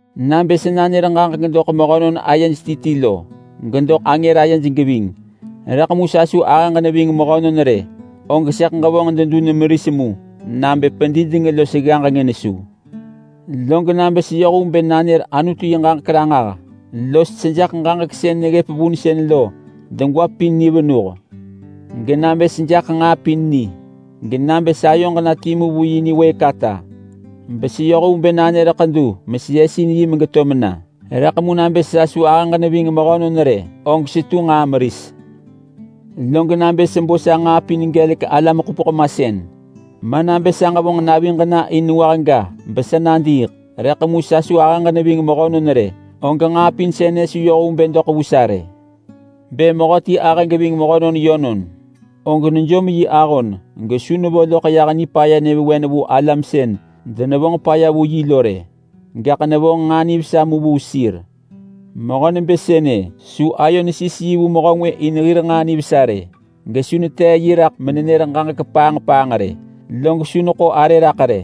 Nabë sa nanër ġaġek doḳ mehönon ayej ti ti lo, gedoḳ angër ayej geving, rëḳ mu sa su ahëġ neving mehönon rë, og sëḳ ġevonġ dedun meris mu nabë pedideng los ggaġeng nesu. Log nabë seyoh vu bë nanër Anutu yi ġaġek ranġah los sejaḳ ġaġek sën neggëp vunsën lo degwa pin ni venuh, genabë sejaḳ nġaa pin ni, genabë sayoġ na timu vu yi niwëëk ata beseyoh vu bë nanër ḳedu meseyesin yi megeto mena, rëḳ mu nabë sa su ahëġ neving mehönon rë, og setu nġaa meris. Log nabë sebo sa nġaa pin gelek alam-ḳupeḳ-masën, ma nabë sa ġevonġ naviġ na in nengwah ga besa nadiiḳ, rëḳ mu sa su ahëġ neving mehönon rë, og nġaa pin sënë su yoh vu bë doḳ vu sa rë. Bë mehöti ahë geving mehönon yönon, og nejom yi ahon gesu nevo loḳ yah nipaya nyëvewen vu alam sën denevonġ vu yi lo rë, gaḳ nevonġ nġaa nivesa mu vu sir. Mehö nebë sënë su ayo nesis yi vu mehö ngwë in hir nġaa nivesa rë, gesu netee yi raḳ menenër ġaġek paanġ paanġ rë, log su neḳo arë raḳ rë.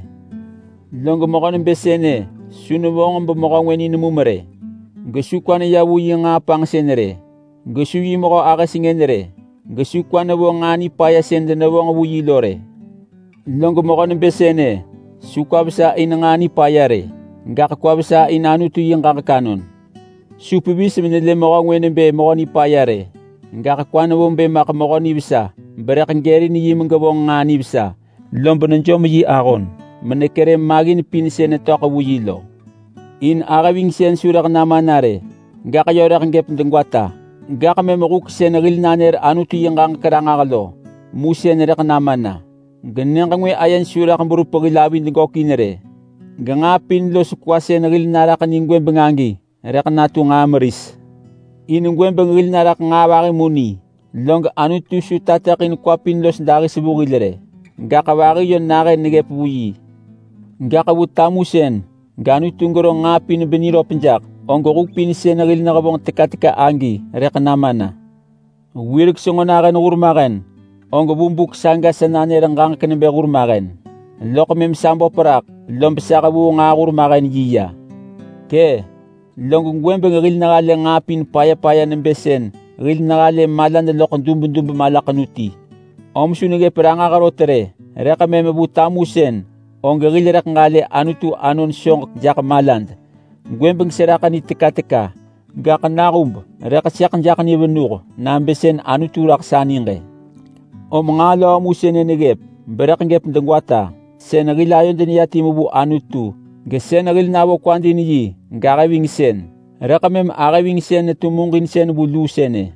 Log mehö nebë sënë su nevonġ bemehö ngwë ni nemum rë. Gesu kwa neya vu yi nġaa panġsën rë, gesu yi mehö ahë sengën rë, gesu kwa nevo nġaa nipaya sën denevonġ vu yi lo rë. Log mehö nebë sënë su kwa vesa in nġaa nipaya rë, gaḳ kwa vesa in Anutu yi ġaġek anon. Su pevis menelë mehö ngwë nebë mehö nipaya rë, gaḳ kwa nevo bë maḳ mehö nivesa berëḳ gërin yi megevonġ nġaa nivesa, lob nejom yi ahon menekerë maggin pin sën netöḳ vu yi lo. In ahë vingsën su rëḳ nama na rë, gaḳ yö rëḳ gëp degwata! Gaḳ mëm huk sën hil nanër Anutu yi ġaġek ranġah lo, mu sën rëḳ nama na. Genyëġ ngwë ayej su rëḳ berup hil avid gökin rë, genġaa pin los kwa sën hil naraḳ ni gwëbeng agi rëḳ natu nġaa meris. In gwëbeng hil naraḳ nġaa vahi mu ni. Log Anutu su tateḳin kwa pin los dahis vu hil rë, gaḳ vahi yö nahën neggëp vu yi. Gaḳ vu tamusën gAnutu gero nġaa pin beniröp jaḳ, og huk pin sën hil nehevonġ teka teka agi rëḳ nama na. Wirek senġo nahën hurmahen og vu buk saga sa nanër ġaġek nebë hurmahen. Loḳ mëm sa böp raḳ, lob sa hevuu nġaa hurmahen yi ya. Kë! Log gwëbeng hil nehalë nġaa pin paya paya nebë sën hil nehalë malad loḳ dubdub malaḳenu ti, om su neggëp ranġah rot rë. Rëḳ mëm vu tamusën og hil rëḳ ġalë Anutu anon soġek jaḳ malad. Gwëbeng seraḳ ni teka teka, gaḳ nahub rëḳ sëḳ jaḳ ni venuh nabë sën Anutu raḳ sa niġ-ë. Om nġaa löö mu sënë neggëp berëḳ gëp degwata: Sën hil ayod neya timu vu Anutu, gesën hil navo kwad in yi, gahë-vingsën. Rëḳ mëm ahë-vingsën netu muġinsën vu luu sënë.